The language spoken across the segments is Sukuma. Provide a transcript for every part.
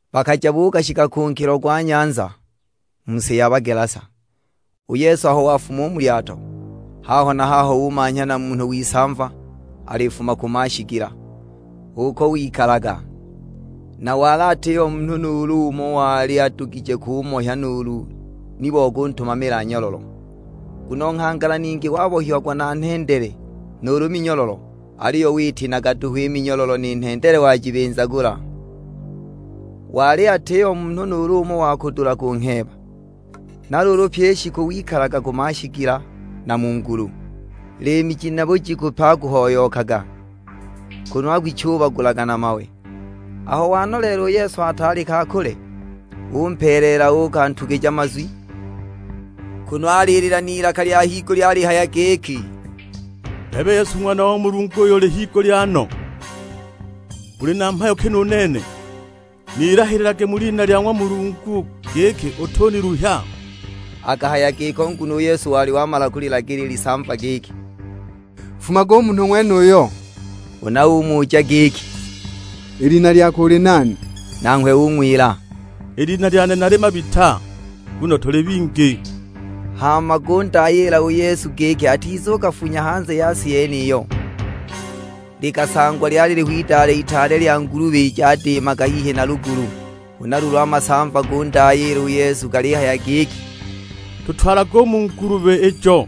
Bakaja buukashika ku nkilo gwa nyanza, mu si ya Bagelasa. U Yesu aho wafuma u mu lyato, haho na haho umanhya na munhu w'isamva, alifuma ku mashigila. H'uko wikalaga, na wali atiho munhu nuulu umo uyo wali adugije kumohya nuulu ni bo kutumamila nyololo. Nguno nghangala ningi wabohiagwa na nhendele nuulu minyololo; aliyo witinaga duhu i minyololo, ni nhendele wajibinzagula! Wali atiho munhu nuulu umo wa kudula kungheeba. Na luulu pyi i shiku wikalaga ku mashigila na mu ngulu; liimi ji na bujiku pe akuhoyookaga, kunu akwichubagulaga na mawe. Aho wanoleela u Yesu ataali ka kule, umpeeleela uukantugija mazwi, kunu alilila n'ilaka lya higulya alihaya giki, "Bebe Yesu Ng'wana wa ng'wa Mulungu uyo ali higulya no, uli na mhayo ki nu nene? Nilahililage mu lina lya ng'wa Mulungu giki utuniluhya!" Akahaya giko nguno u Yesu wali wamala kulilagila i lisamva giki, "Nfumage u munhu ng'wenuyo." Huna umuja giki, "I lina lyako uli nani?" Nanghwe ung'wila, "I lina lyane nali Mabita, nguno tuli bingi." Hama gundayiila u Yesu giki atizugafunya hanze ya si yeniyo. Likasangwa lyaliho idale itaale lya ngulubi jadiimaga hihi na lugulu. Huna luulu a masamva gundayiila u Yesu galihaya giki, "Tutwalage u mu ngulubi ijo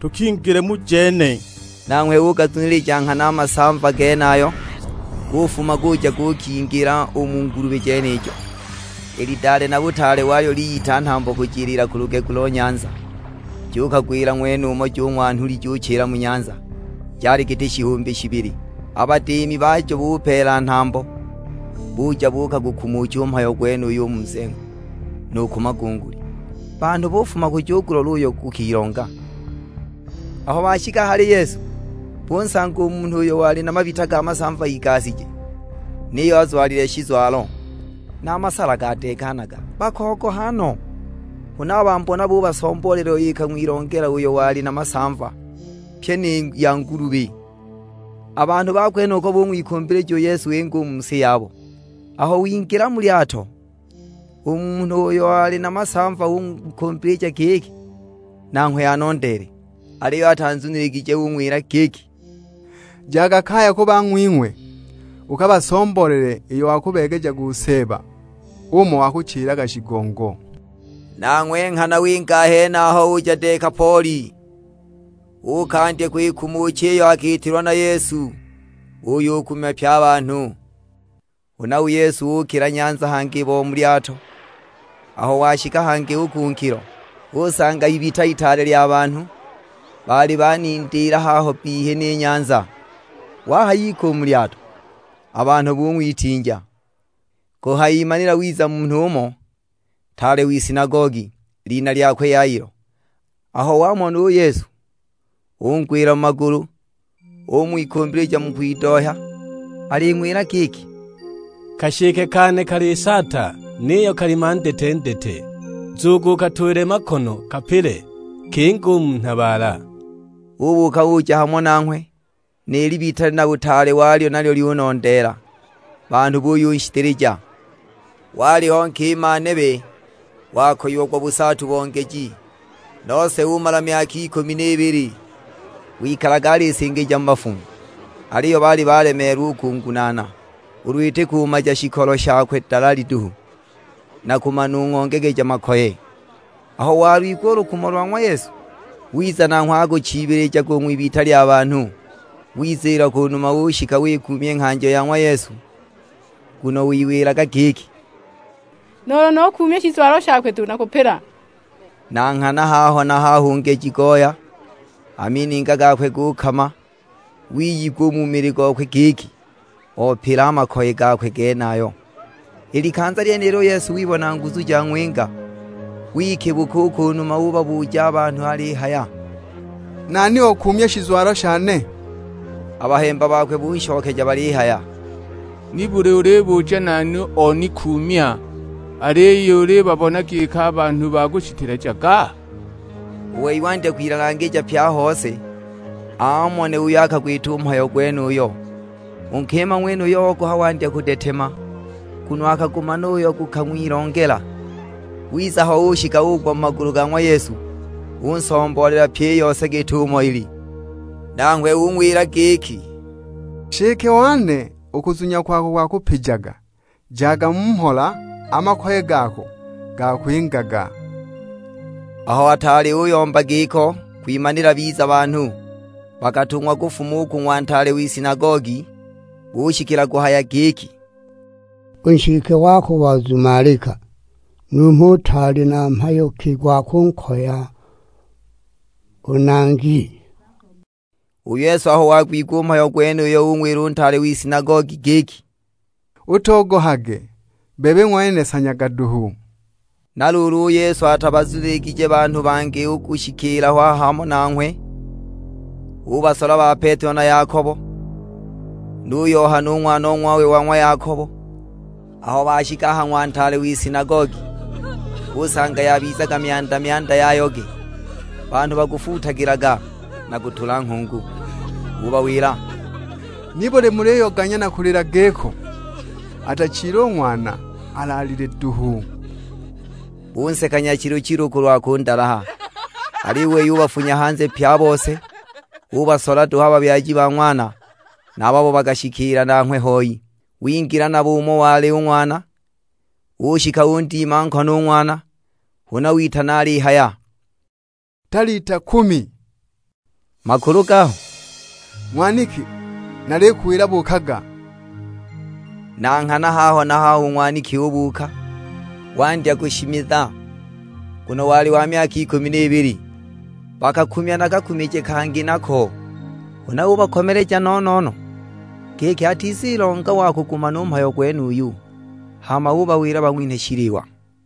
tukingile mu jene!" Nanghwe ugazunilija nghana a masamva genayo, gufuma guja gukingila u mu ngulubi jenijo. I lidale na butaale walyo liyita nhambo kujiliila ku lugegu lo nyanza, jukagwila ng'wenumo jung'wa nhuli juchila mu nyanza, jali giti shihumbi shibili! A badiimi bajo bupeela nhambo, buja buukagukumucha u mhayo gwenuyo u mu nzengo, nu ku magunguli. Banhu bufuma kuja kugulola uyo gukilonga. Aho bashika a hali Yesu, bunsanga u munhu uyo wali na mabita ga masamva igashije, niyo azwalile shizwalo, na a masala gadeekanaga. Bakogoha no! Huna a bambona bubasomboolela iyo ikang'wilongela uyo wali na masamva; pyi ni ya ngulubi. A banhu ba kwenuko bung'wikumbilija u Yesu inge u mu si yabo. Aho wingila mu lyato, u munhu uyo oli na masamva ung'wikumbilija giki nanghwe anondeele. Aliyo atanzuniligije. Ung'wila giki, "Jaga kaya ku bang'wing'we, ukabasomboolele iyo wakubeegejaga u Seeba, umo wakuchilaga shigongo." Nanghwe nghana winga a henaho uja Dekapoli makulu gaho: mizengo ikumi.', uukandya kwikumucha iyo akiitilwa na Yesu, buyukumya pye a banhu! Huna u Yesu ukila nyanza hangi bo mu lyato, aho washika hangi u ku nkilo, usanga ibita itaale lya banhu, baali banindiila haho bbihi ni nyanza. Wahayika u mu lyato, a banhu bung'witinja. Kuhayimanila wiza munhu umo, ntaale w'isinagogi; lina lyakwe Yailo. Aho wamona u Yesu, ungwila mu magulu. Ung'wikumbilija mu kwidohya, aling'wila giki, "Kashike kane kalisaata, niyo kali mandetendete, nzugu ukatuulile makono kapile, kinge u mu nhabaala!" Ubuuka uja hamo nanghwe, ni libita na butaale walyo nalyo lyunondeela; banhu buyunshiteleja. Waliho nkima nebe, wakoyiagwa busaatu bo ngeji, nose umala myaka ikumi n'ibili. Wikalaga akusingijaga mu bafumu, aliyo baali balemeelwa u kungunaana, ulu iti kumaja shikolo shakwe dalali duhu, na kumanung'ongegeja makoye! Aho walwigwa u lukumo lwa ng'wa Yesu, wiza nanghwe akuchiibilijaga u ng'wibita lya banhu; wiziila ku numa ushika wikuumya i nghanjo ya ng'wa Yesu. Nguno wiwilaga giki, "Nuulu nukuumya shizwalo shakwe duhu nakupila!" Na nghana haho na haho u ngeji goya, a mininga gakwe gukama, wiyigwa u mu mili gokwe giki, opila a makoye gakwe genayo. I likanza lyenilo u Yesu wibona nguzu jang'winga, wikibuka u ku numa ubabuja a banhu alihaya, "Nani okuumya shizwalo shane?" A bahemba bakwe bunshokeja balihaya, "Nibuli ulibuja nani onikuumya, aliyo ulibabona giki a banhu bakushitelejaga?" U wei wandya kwilalangija pye a hose, amone uyo akagwita u mhayo gwenuyo. U nkima ng'wenuyo ogoha wandya kudetema, nguno akagumana uyo gukang'wilongela; wiza ho ushika ugwa mu magulu ga ng'wa Yesu, unsomboolela pyi i yose git'umo ili. Nanghwe ung'wila giki, "Nshike wane, u kuzunya kwako kwakupijaga, jaga mu mhola, a makoye gako gakwingaga." Aho ataali uyomba giko kwimanila biza banhu, bakatung'wa kufuma u ku ng'wa ntaale w'isinagogi; bushikila kuhaya giki, "U nshike wako wazumalika, numho utaali na mhayo ki gwa kunkoya u Nangi?" U Yesu aho wagwigwa u mhayo gwenuyo ung'wila u ntaale w'isinagogi giki, "Utogohage, bebe ng'wene sanyaga duhu." Na luulu u Yesu atabazuniligije banhu bangi u kushikiila ho hamo nanghwe, ubasola ba Petelo na Yakobo, nu Yohana u ng'wanong'wawe wa ng'wa Yakobo. Aho bashika a ha ng'wa ntaale w'isinagogi, usanga yabizaga myanda-myanda ya yoge; banhu bakufuutagilaga, na kutula nghungu. Ubawila, "Nibuli muliyoganya na kulila giko? Atachile u ng'wana, alaalile duhu!" Bunseka nyachilu-chilu kulwa kundalaha. Aliyo u wei ubafunya hanze pye a bose. Ubasola duhu a babyaji ba ng'wana, na a babo bakashikiila nanghwe hoi; wingila nabo umo wali u ng'wana. Ushika undima nkono u ng'wana; huna witana alihaya, "Talita kumi!" Makulu gaho, "Ng'waniki nalikuwila buukaga!" Na nghana haho na haho u ng'waniki ubuuka, wandya kushimiza, nguno wali wa myaka ikumi n'ibili. Bakakumya na kakumije kangi nako. Huna ubakomeleja no-no-no, giki atizilonga wa kugumana u mhayo gwenuyu, hama ubawila bang'winhe shiliwa.